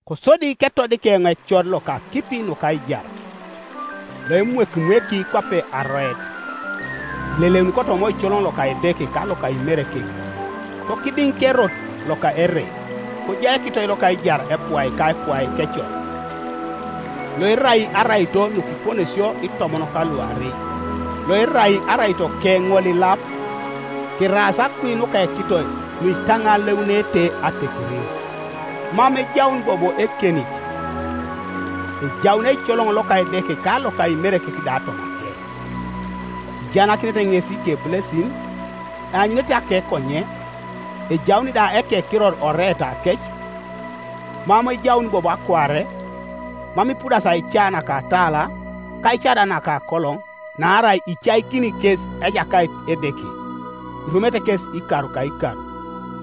Kosodi ketodik eoŋ ecor loka akipi nuka aijar, loemwekimweki kwape aroet, eleleuni kotoma oicoloŋ loka Edeke ka loka Imerekek, kokidiŋ kerot loka ere, kojai ekitoi loka aijar epuai ka epuai kecor, loerai araito nukiponesio itomon kaluarei, loerai araitoke ŋolilap; keraas akui nuka ekitoi nuitaŋaleunete atekerin. Mam ejaun bobo ekenit; ejaun eicoloŋ loka Edeke ka loka Imerekek da tomake; ijaanakinete ŋes ikebulesin; eanyunete akekonyen, ejaun da ekekiror oreetake. Mam ejaun bobo akuare; mam ipudasi aica naka atala, ka aica da naka akoloŋ, naarai icaikini kes Ejakait Edeke, irumete kesi ikar ka ikar.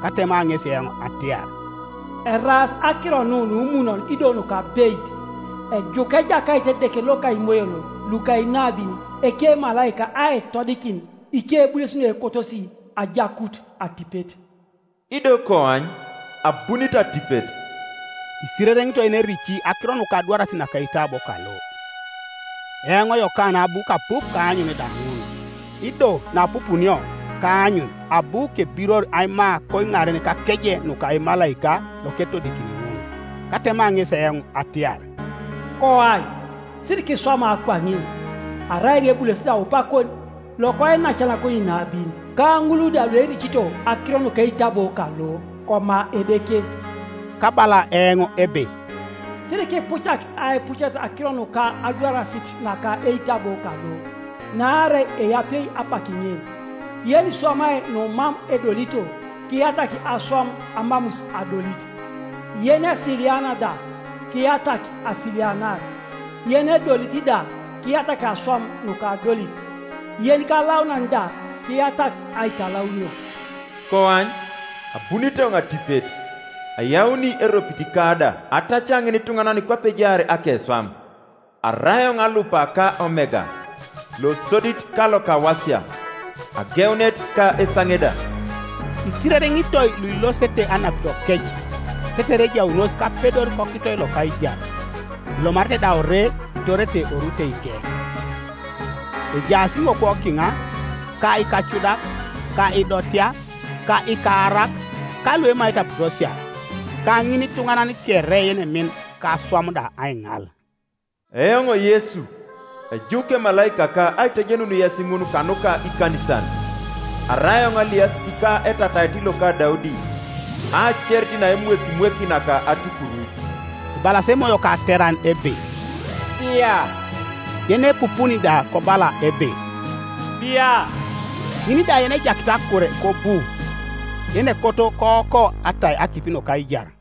Katema ŋesi eoŋ atiar, “Eraas akiro nu numunon ido nukabeit. Ejuku Ejakait Edeke loka imoyon luka inabin ekemalaika aitodikin ikebulesin nuekotosi ajakut atipet. Ido koany, abunit atipet.” Isirereŋitoi yenerici akiro nuka adwarasit naka eitabo kalo. Eoŋ Yokana abu kapup ka aanyun da ŋun, Ido naapupunio ka aanyun abu kebiror aima koiŋaren kakeje nuka emalaika loketodikini ŋun. Katema ŋesi eoŋ atiar, “Koany, sirikiswama kwaŋin! Arai eoŋ ebulesit aupakon lokoinacanakon inabin, ka ŋul da luericito akiro nuka eitabo kalo. Koma Edeke.” Kabala eoŋ ebe, “Sirikipucak aipucet akiro nuka adwarasit naka eitabo kalo, naarai eapie apak ŋin. Yeniswamai numam edolito, kiyatak aswam amamus adolit, yenesiliana da, kiyatak asilianar, yenedolit da kiyatak aswam nukadolit, yenikalaunan da kiyatak aitalaunio.” “Koany, abunit eoŋ atipet, ayauni eropitika da, atacia ŋinituŋanan kwape ejaar akeswam. Arai eoŋ Alupa ka Omega, losodit ka lokawasia, ageunet ka esaŋe da.” Isirereŋitoi luilosete anapitokec, tetere ejaunos kapedor kokitoi loka aijar, elomarete da ore itorete oruteike. Ejaas iŋokwo kiŋa, ka ikacudak, ka idotea, ka ikaarak, ka luemaete aputosia, ka ŋinituŋanan kere yenemin ka aswam da aiŋal. “Eoŋ Yesu ejuk emalaikaka aitejenun yes ŋun kanuka ikanisan. Arai eoŋ aliasit ka etatait loka Daudi, aacerit naemwekimweki naka atupuruc.” Ebalas Emoyo ka ateran ebe, “Bia.” Yenepupuni da kobala ebe, “Bia.” Ŋin da yenejakit akure kobu; yenekoto kooko atai akipi nuka aijar.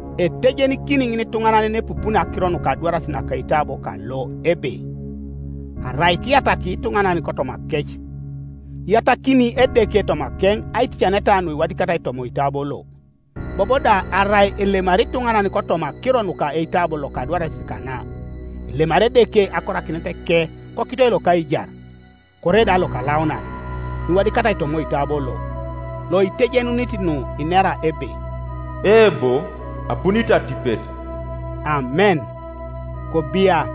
Etejenikini ŋinituŋanan yenepupuni akiro nuka adwarasit naka eitabo kalo ebe: Arai kiyataki ituŋanan kotomakec, iyatakini Edeke tomakeŋ aiticaneta nuiwadikatai toma oitabo lo, bobo da arai elemari ituŋanan kotoma akiro nuka eitabo loka adwarasit kana, elemari Edeke akorakineteke kokitoi loka aijar, kore da lokalaunan, nuiwadikatai toma oitabo lo. Loitejenunit nu inera ebe, “Eebo, abunit atipet.” Amen. Kobia,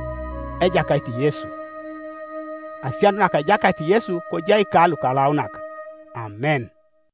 Ejakait Yesu! Asianut naka Ejakait Yesu kojai ka lukalaunak; Amen.